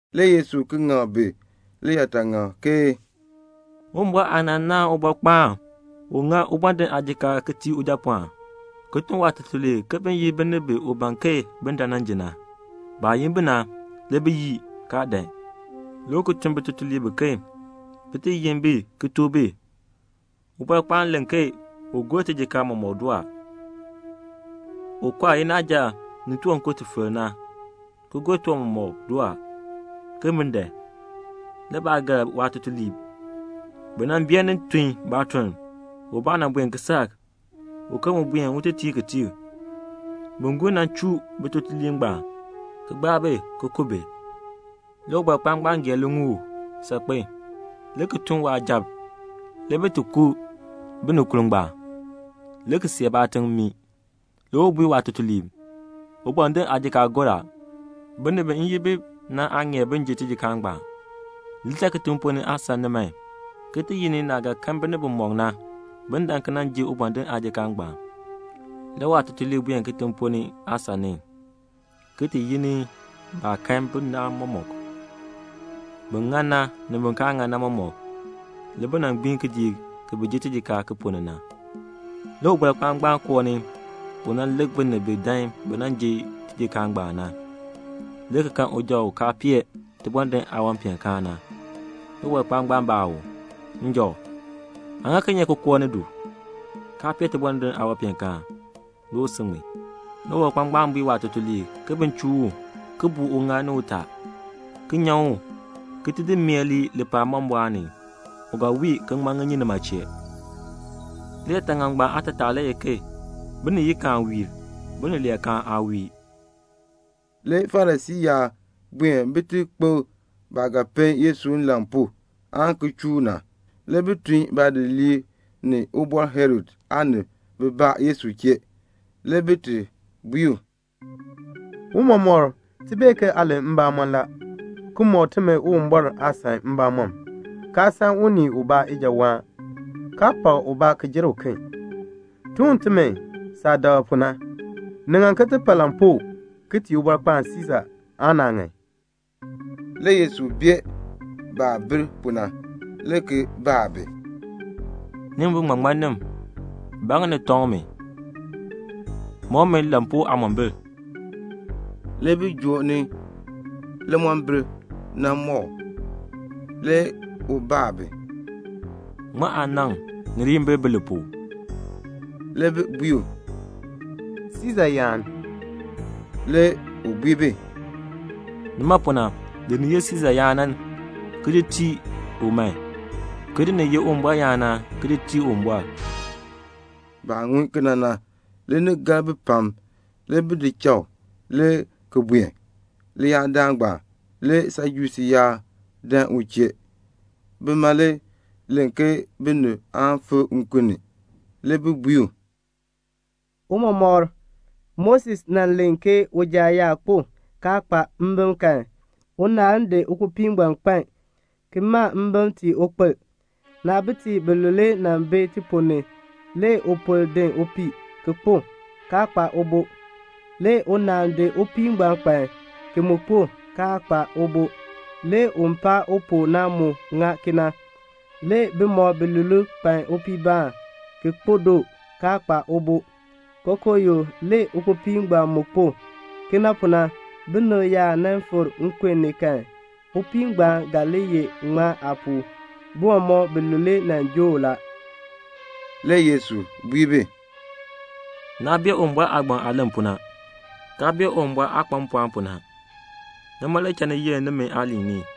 Le Yesu ki ŋak bi liyaataŋakl ke, "Uwumbɔr aanaan naahn ubɔrkpaan u ŋa ubɔndinn aajikaar ki tii ujapɔɔn na, le ki tun waatutuliib ke bin yin binib bi u ban ke bin dan nan ji na. Baah yin bi na, le bi yii, kaa dan. Le u ki tun bitutuliib biken bi ti yin bi ki tuk bi, 'Ubɔrkpaan len ke u gor tijikaar mɔmɔk doo a. U kɔr inaaja ni tiwankur ti filk na, ki gor tiwan mɔmɔk doo a, ke bin dan.' Le baa gar waatutuliib. Bi beenin tun baatuln; ubaa buen kisaak, uken mu buen un ti tiir kitiir. Bin gur na chuu bitutuliib ngbaan, ki gbaa bi ki ku bi. Le ubɔrkpaan ngbaan gee liŋuul saakpen, le ki tun waasujatiib, le bi ku binikurb ngbaan, le ki see baatiŋ mmii. Le u bui waatutuliib, 'Ubɔndinn aajikaar gor a. Binib bi m yin bi na aa ŋeer bin ji tijikaar ngbaan. Li cha kitiŋ ponn ni aasan ni man, ki ti yi ni naah ga kan binib bimɔk na, bin dan ki nan ji ubɔndinn aajikaar ngbaan.' Le waatutuliib buen kitiŋ ponn ni aasan ni, ki ti yi ni baah kan bi na mɔmɔk, bin ŋan na ni bin kaa ŋan na mɔmɔk. Le bi gbiin kidiik ki bi ji tijikaar ki ponn ni na. "Le ubɔrkpaan koo ni un lik binib bi dan bin ji tijikaar ngbaan na, le ki kan uja u kaa pee tibɔndinn aawanpeenkaan na. Le ubɔrkpaan baa u, 'Njɔ, aa ŋa kinye ki koo ni du, kaa pee tibɔndinn aawanpeenkaan?' Le u si ŋmin. Le ubɔrkpaan bui waatutuliib ke bin chuu u, ki buu uŋaal ni utaa, ki nyan u, ki di mee lii lipaal mbɔmbɔɔn ni. U ga wii ki ŋman ŋinyin nima chee. "Liyaataŋakl ngbaan aatataa le ye ke biniyikaan wiir, binileekaan aa wiir." Le Farisii yaab buen bin ti kpokl baah ga pe Yesu nlan pu aan ki chuu u na. Le bi tun baadidiliib ni Ubɔr Herod aanib bibaa Yesu chee. Le bi bui u, "Tiicha, ti bee ke aa len mbamɔn la, ki mɔk timi Uwumbɔr aasan mbamɔm, kaa san unii ubaa ijawaan, kaa pak ubaa ki jer uken. Tuk timi saah dak pu na. Ni ŋan ti paa lampuu ki tii Ubɔrkpaan Siisa aan naa ŋan?" Le Yesu bee baah bir pu na, le ki baa bi, "Nimi biŋmaŋmannim, ba ŋa ni tɔŋ mi? Mɔk mi lampuu aamombil." Le bi joo ni limombil nan mɔk u. Le u baa bi, "Ŋmaa aanaŋ ni liyimbil bi li pu?" Le bi bui u, "Siisa yaan." Le u bui bi, "Nima pu na, di ni ye Siisa yaan na, ki di tii u man, ki di ni ye Uwumbɔr yaan na, ki di tii Uwumbɔr." Baah ŋun kena na, le ni gar bi pam. Le bi di cha u le ki buen. Leyaadaal ngbaan le Sajusii yaab dan u chee. Bima le len ke binib aan fikr nkun ni. Le bi bui u, "Tiicha, Moses nan len ke uja yaa kpo, kaa kpa mbim kan, unaal n di ukpopii ngbaan di kpan, ki ma mbim ki tii ukpil. Naabitiib bilule nan bi ti ponn ni. Le upol din upii, le ki kpo, kaa kpa ubo. Le unaal di ukpopii ngbaan kpan, ki mu kpo, kaa kpa ubo. Le un paa u pu na mu ŋa kena. Le bimɔk bilule kpan upii ubaa, ki kpo doo, kaa kpa ubo. Kookooyoo, le ukpopii ngbaan mu kpo. Kena pu na, binib yaa nan fikr nkun ni kan, upii ngbaan ga li ye ŋmaa aapuu? Bi mɔmɔk bilule nan joo u la." Le Yesu bui bi, "Naa bee Uwumbɔr aagbaŋ aah len pu na, kaa bee Uwumbɔr aah kpa mpɔɔn pu na. Nima le cha ni yenn nimi aaliin ni.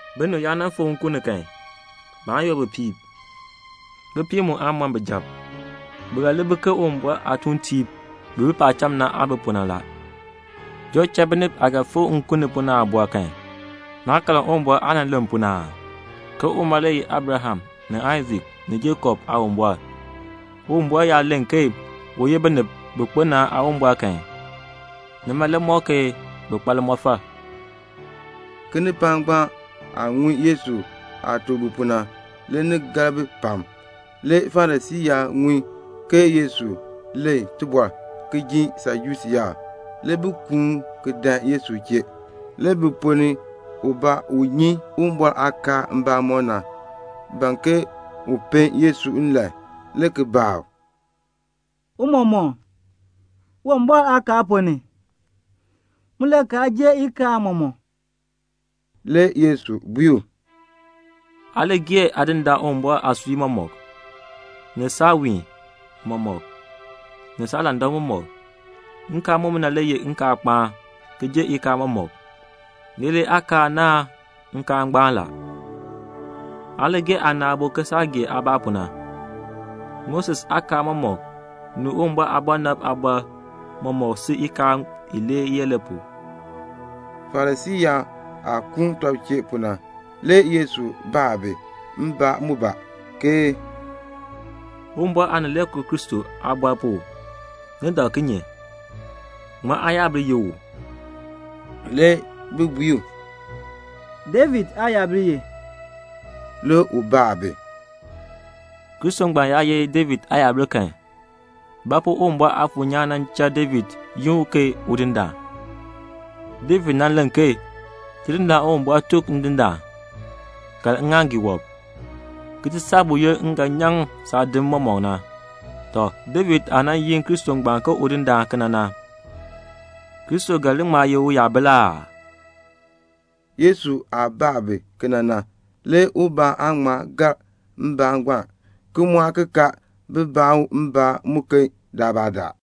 Binib yaa nan fikr nkun ni kan, baan yoor bipiib, bipiib mu aan mɔn bijab. Bi ga li bi ke Uwumbɔr aatuuntiib bi bi paacham na aah bi pu na la. Joo cha binib aah ga fikr nkun ni pu na aabɔr, naa karn Uwumbɔr aah nan len pu na aa? ke uma le ye Abraham ni Aisak ni Jakob Aawumbɔr. Uwumbɔr yaa len ke u ye binib bi kpo na Aawumbɔr kan, nima le ŋmɔk ke bi kpa limɔfal." Kinipaak ngbaan aah ŋun Yesu aah tuk bi pu na, le ni gar bi pam. Le Farisii yaab ŋun ke Yesu len tibɔr ki jin Sajusii yaab. Le bi kuun ki dan Yesu chee. Le bi ponn ni ubaa, u bee Uwumbɔr aakaal mbamɔm na, ban ke un pen Yesu nlan, le ki baa u, "Tiicha, Uwumbɔr aakaal ponn ni, mulakaal jern ikaal mɔmɔk?" Le Yesu bui u, "'Aa li gee Aadindaan Uwumbɔr aasui mɔmɔk, ni saawiin mɔmɔk, ni saalandak mɔmɔk.' Nkaal mumina le ye nkaalkpaan ki jer ikaal mɔmɔk. Leelee aakaal naahn nkaal ngbaan, 'Aa li gee aana aabo ke saah gee aabaa pu na.' Moses aakaal mɔmɔk, ni Uwumbɔr aabɔnabtiib aaliin mɔmɔk sil ikaal ilee yee pu la." Farisii yaab aah kuun tɔb chee pu na, le Yesu baa bi mbaan mubaa, ke "Uwumbɔr Aanileekoo Kristo aabɔr pu, ni dak kinye? Ŋmaa aayabil ye u?" Le bi bui u, "David aayabil ye." Le u baa bi, "Kristo ngbaan yaa ye David aayabil kan, ba pu Uwumbɔr Aafuur nyaan nan cha David yi u ke 'Udindaan'? David nan len ke 'Tidindaan Uwumbɔr tuk Ndindaan: Kaln ŋŋaaŋgii wɔb, ki ti saa buyoonn m ga nyaŋ saadim mɔmɔk na.' Tɔ, David aah nan yi Kristo ngbaan ke Udindaan kena na, Kristo ga li ŋma ye uyabil aa?" Yesu aah baa bi kena na, le ubaa aa ŋma gar mbaan ngbaan, ki mu aa ki kaar bin baa u mbaan muken daalbaadaal.